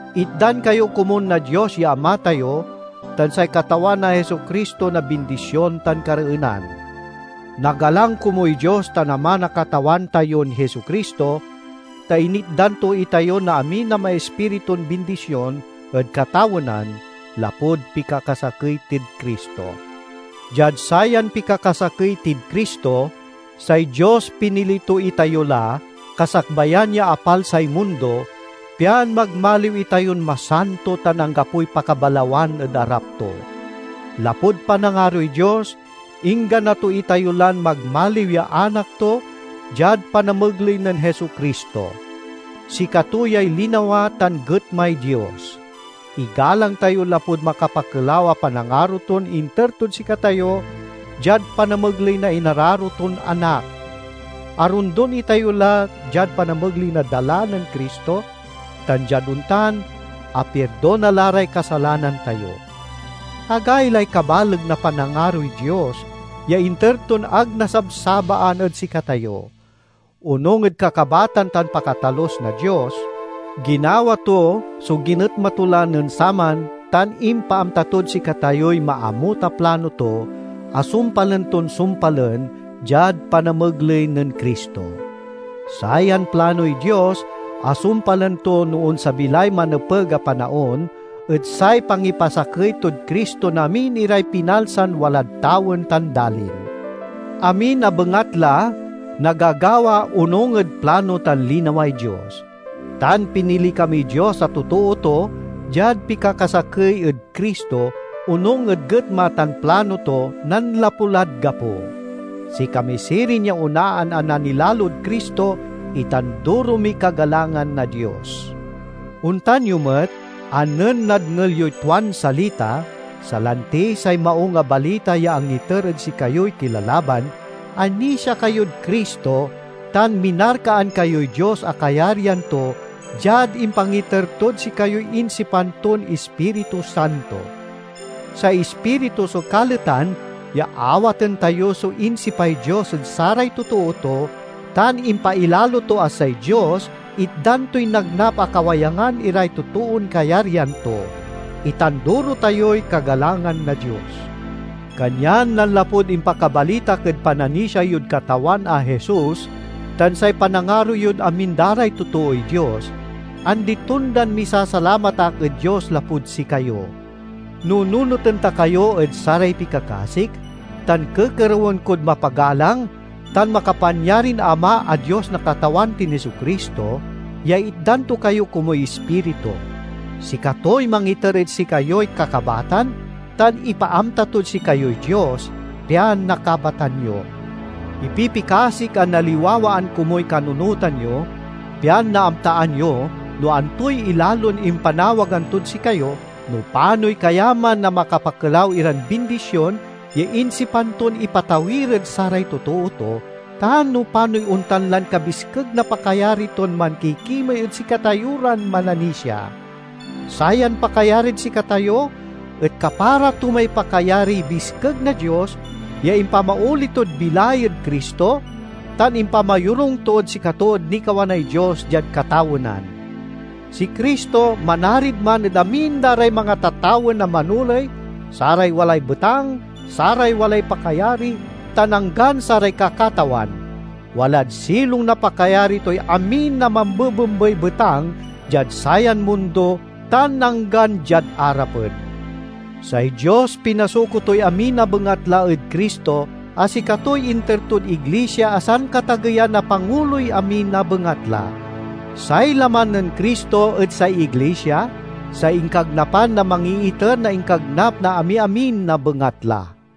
Itdan kayo komun na Dios ya Ama tayo tan say Katawan a Jesu-Cristo na bindision tan kareenan. Nagalang komuy Dios tan Ama na Katawan tayon Jesu-Cristo, ta initdan to itayo na amin a maispiritun bindision ed katawenan, lapud pikakasakey tid Cristo. Diad sayan pikakasakey tid Cristo, say Dios pinili to itayo la, kasakbayan ya apalsay mundo, pian magmaliw itayon masanto tan anggapoy pakabalawan ed arap to. Lapud panangaroy Dios, inggana to itayo lan magmaliw ya anak to diad panamegley nen Jesu-Cristo. Sikato yay linawa tan getmay Dios. Igalang tayo lapud makapakelaw a panangaro ton inter tod sikatayo diad panamegley na inararo ton Anak! Arondon itayo la diad panamegley na dala nen Cristo tan diad ontan, apirdona la ray kasalanan tayo. Agaylay kabaleg na panangaroy Dios, ya inter ton ag nasabsabaan ed sikatayo! Onung ed kakabatan tan pakatalus na Dios ginawa to so ginetma to la nen saman tan impaamta tod sikatayoy maamut a plano to a sumpalen ton sumpalen diad panamegley nen Cristo. Sayan planoy Dios a sumpalen to no onsabi lay manepeg a panaon et say pangipasakey tod Cristo na amin iray pinalsan walad tawen tan dalin. Amin a bengatla nagagawa onung ed plano tan linaway Dios; tan pinili kamiy Dios a totoo to diad pikakasakey ed Cristo, onung ed getma tan plano to nanlapu lad gapo. Sikami sirin ya onaan a nanilalod Cristo, itanduro miy kagalangan na Dios! Ontan yo met, a nen nadngel yoy tuan salita, salanti say Maung a Balita ya angiter ed sikayoy kilalaban, anisia kayod Cristo, tan minarkaan kayoy Dios a kayaryan to diad impangiter tod sikayoy insipan ton Ispiritu Santo. Say Ispiritu so kaletan ya awaten tayo so insipay Dios ed saray totoo to, tan impailalo to a say Dios itdan toy nagnap a kawayangan iray totoon kayaryan to. Itanduro tayoy kagalangan na Dios! Kanyan nanlapud impakabalitak ed pananisia yod Katawan a Jesus tan say panangaro yod amin da ray totooy Dios, andi-tondan misasalamat ak ed Dios lapud sikayo. Nununoten ta kayo ed saray pikakasik, tan kekerewen kod mapagalang tan makapanyarin Ama a Dios na Katawan tin Jesu-Cristo, ya itdan to kayo komuy Ispiritu. Sikatoy mangiter ed sikayoy kakabatan, tan ipaamta tod sikayoy Dios, pian nakabatan yo. Ipipikasik a naliwawaan komuy kanunotan yo pian naamtaan yo no antoy ilalon impanawagan tod sikayo, no panoy kayaman na makapakelaw iran bindision ya insipan ton ipatawir ed saray totoo to, tan no panoy ontan lan kabiskeg na pakayari ton mankikimey ed sikatayo ran mananisia. Sayan pakayarid sikatayo et kapara to may pakayariy biskeg na Dios ya impamaoli tod bilay ed Cristo, tan impamayorung tod sikato ed nikawanay Dios diad katawenan. Si Cristo manarid man ed amin da ray mangatatawen a manoley, saray walay betang, saray walay pakayari, tan anggan saray kakatawan; walad silong na pakayari toy amin a mambebembey betang diad sayan mundo tan anggan diad arapen. Say Dios pinasuko toy amin a bengatla ed Cristo, a sikatoy inter tod iglisia a sankatageyan a panguloy amin a bengatla. Say laman nen Cristo et say iglisia, say inkagnapan na mangiiter na inkagnap na amiamin a bengatla.